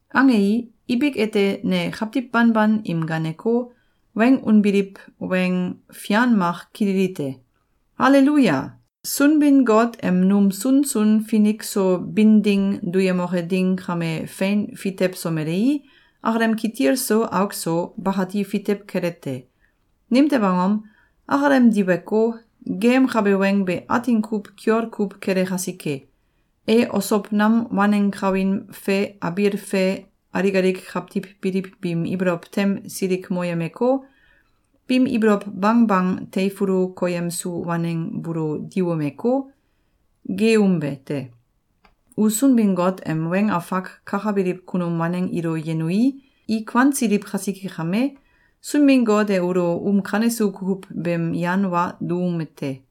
Angei, ibik ete ne kawtiw banban im gaaneko, weng unbiliw weng fian mak kililite: “Aleluya! Sunbin-Got em num sunsun finik so bin ding duyemoke ding kame fein fitewsomelei, akalem kitil so auk so, bakati fitew kele te. Nimtew angom? Akalem diweko, geeyemkabe weng be atin kuw kiol kuw kele kasike. E osow nam waneng kawin fe abiil fe alik alik kawtiw biliw biim ibolow tem silikmoyemeko, biim ibolow bangbang teifulu koyemsu waneng buulo diwumeko, geeumbe te. U Sunbin-Got em weng afak kakabiliw kunum waneng ilo yenui, i kuansiliw kasike kame, Sunbin-Got e ulo um kanesu kukuw beem yan wa duume te.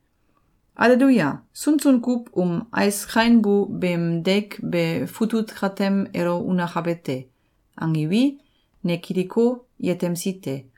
Aleluya! Sunsun kuw um ais kainbu beem deik be futut katem elo unakabe te!”, angiwi, ne kiliko, yetemsi te.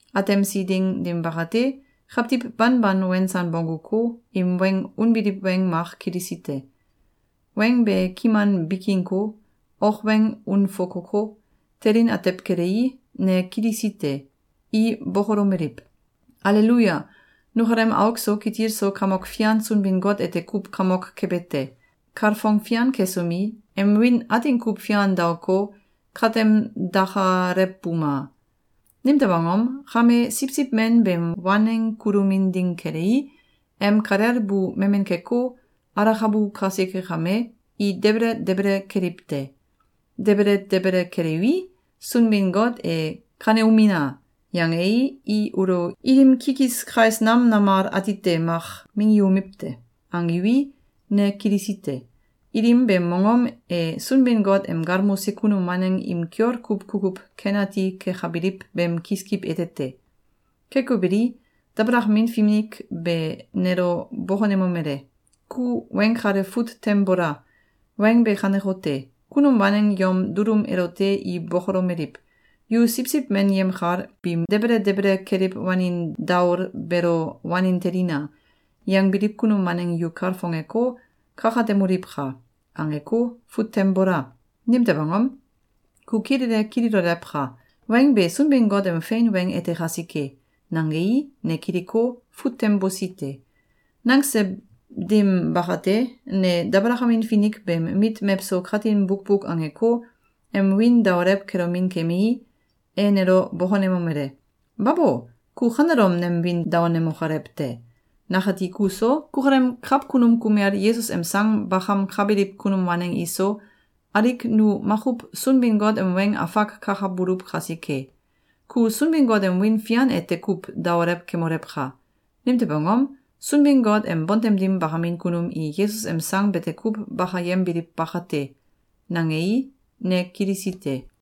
Atemsi ding dim bakate, kawtiw banban wensan bongguko, im weng unbiliw weng mak kilisi te. Weng be kiman bikinko, ok weng unfokoko, telin atew kelei, ne kilisi te. I bokolomeliw: “Aleluya! Nukalem auk so kitil so Kamok Fian Sunbin-Got ete kuw kamok kebe te! Kalfong fian kesomi, em wiin atin kuw fian daoko, katem dakalewbuma! Nimtew angom? Kame, Siwsiw Men beem waneng kulomin ding kelei, em kalel bu memen keko, alakabu kasike kame, i debele debele keliw te. Debele debele keliwi, Sunbin-Got e ‘Kaneumina!’, yangei, i ulo ilim kikis kais nam namal atite mak minggiumiw te.”, angiwi, ne kilisi te. Ilim beem mongom e Sunbin-Got em galmose kunum waneng im kiol kuw kukuw ken ati kekabiliw beem kiskiw ete te. Keko beli, dabalakamin finik be nelo bokonemomele: “Ku weng kale fut tem bola! Weng be kanekote: ‘Kunum waneng yom dulum elote i bokolomeliw: ‘Yu Siwsiw Men yemkal biim debele debele keliw wanin daol beelo wanen telina!’, yangbiliw kunum waneng yu kalfongeko, kakatemoliwka!’, angeko, fut tem bola! Nimtew angom? Ku kilele kililolewka! Weng be Sunbin-Got em fein weng ete kasike!”, nangei, ne kiliko, fut tem bosi te. Nangse dim bakate, ne dabalakamin finik beem mit mewso katin bukbuk angeko, em wiin daolew kelomin kemii, e nelo bokonemomele: “Babo! Ku kanelom nem wiin daonemokolew te! Nakati kuso, kukalem kawkunum kumel Yesus em sang bakamkabiliw kunum waneng iso, alik nu makuw Sunbin-Got em weng afak kakabuluw kasike. Ku Sunbin-Got em wiin fian ete kuw daolew kemolewka! Nimtew angom? Sunbin-Got em bontem dim bakamin kunum i Yesus em sang bete kuw bakayembiliw bakate.”, nangei, ne kilisi te.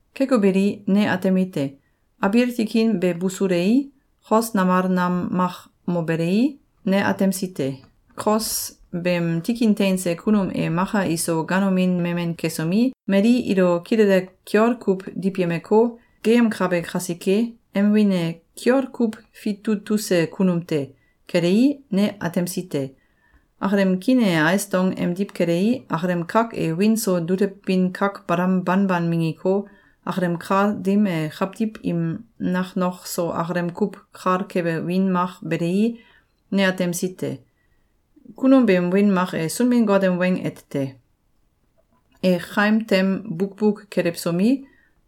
Keko beli, ne atemite: Abiil tikin be busulei, kos namal nam mak mobelei, ne atemsi te. Kos beem tikin teinse kunum e maka iso ganomin memen kesomi, mali ilo kilele kiol kuw diwyemeko, geeyemkabe kasike, em wiin e “Kiol kuw Fitutuse Kunum te!” kelei, ne atemsi te. Akalem kiin e ais dong emdiw kelei, akalem kak e wiin so dulewbin kak balam banban minggiko, akalem kal dim e kawtiw im naknok so akalem kuw kal kebe wiin mak belei, ne atemsi te. Kunum beem wiin mak e “Sunbin-Got em Weng” ete te. E kaim tem bukbuk kelewsomi,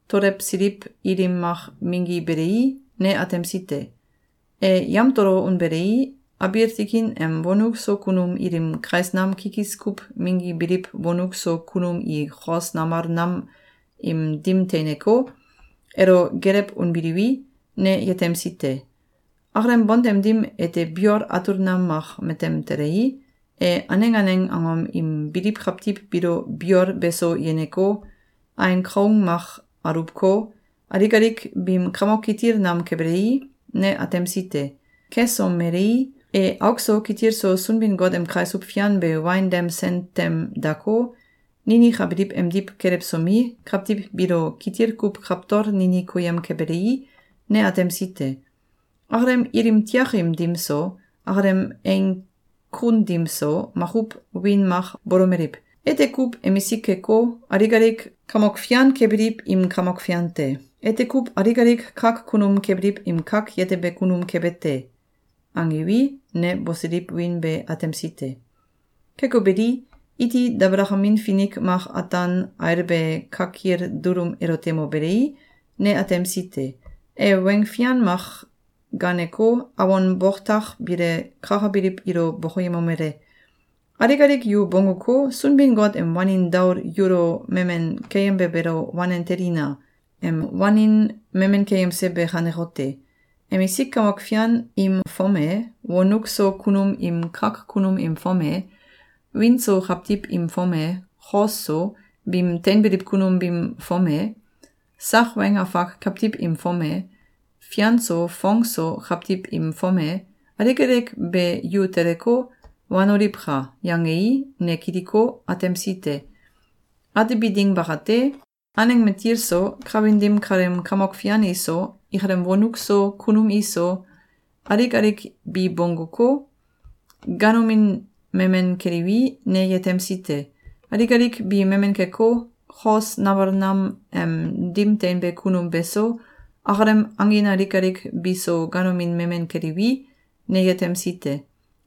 tololewsiliw ilim mak minggibelei, ne atemsi te. E yamtolo unbelei, abiil tikin em wonuk so kunum ilim kais nam kikis kuw minggibiliw wonuk so kunum i kos namal nam im dim teineko, elo gelew unbiliwi, ne yetemsi te. Akalem bontem dim ete biol atul nam mak matem telei, e aneng aneng angom im biliw kawtiw biilo biol beso yeneko, ain kaung mak aluwko, alik alik biim kamok kitil nam kebelei, ne atemsi te. Kesomelei, e auk so kitil so Sunbin-Got em kaisuw fian be wain dem sen tem dako, ninikabiliw emdiw kelewsomi, kawtiw biilo kitil kuw kawtol nini koyem kebelei, ne atemsi te. Akalem ilim tiakim dim so, akalem eing kun dim so, makuw wiin mak bolomeliw: “Ete kuw emisik keko, alik alik kamok fian kebiliw im Kamok Fian te. Ete kuw alik alik kak kunum kebiliw im kak yetebe kunum kebe te.”, angiwi, ne bosiliw wiin be atemsi te. Keko beli, iti dabalakamin finik mak ataan ailbe kakil dulum elote mobelei, ne atemsi te. E weng fian mak gaaneko, awon boktak bile kakabiliw ilo bokoyemomele: “Alik alik yu bongguko, Sunbin-Got em wanin daol yulo memen keyembe beelo wanen telina! Em wanin memen keyemse be kanekote: Emisik kamok fian im fom e, wonuk so kunum im kak kunum im fom e, wiin so kawtiw im fom e, kos so, biim teinbiliw kunum biim fom e, sak weng afak kawtiw im fom e, fian so fong so kawtiw im fom e, alik alik be yu teleko, wanoliwka!”, yangei, ne kiliko, atemsi te. Atebi ding bakate, aneng matil so, kawin dim kaleem kamok fian iso, ikalem wonuk so kunum iso, alik alik bi bongguko, ganomin memen keliwi, ne yetemsi te. Alik alik bi memen keko, kos namal nam em dim teinbe kunum beso, akalem angin alik alik biso ganomin memen keliwi, ne yetemsi te.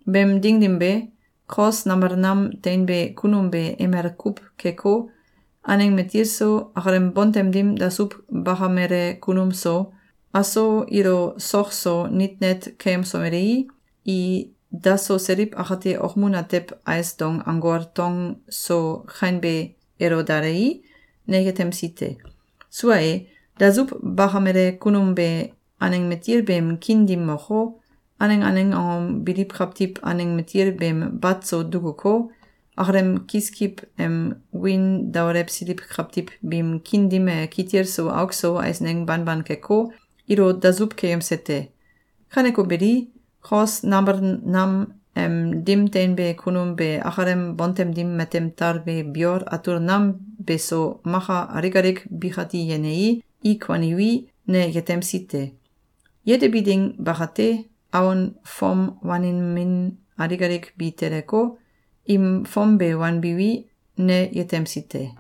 Beem ding dim be, kos namal nam teinbe kunum be emel kuw keko, aneng matil so, akalem bontem dim dasuw bakamele kunum so, aso ilo sok so nit net keyemsomelei, i daso seliw akate okmun atew ais dong anggol tong so kainbe elo dalei, ne yetemsi te. Sua e, dasuw bakamele kunum be aneng matil beem kiin dim moko, aneng aneng angom biliw kawtiw aneng matil beem bat so dukuko, akalem kiskiw em wiin daolewsiliw kawtiw biim kiin dim e kitil so auk so eisneng banban keko, ilo dasuw keyemse te. Kaneko beli, kos namal nam em dim teinbe kunum be akalem bontem dim matem talbe biol atul nam beso maka alik alik bikati yenei, i kuaniwi, ne yetemsi te. Yetebi ding bakate, awon fom wanin min alik alik bi teleko, im fom be wanbiwi, ne yetemsi te.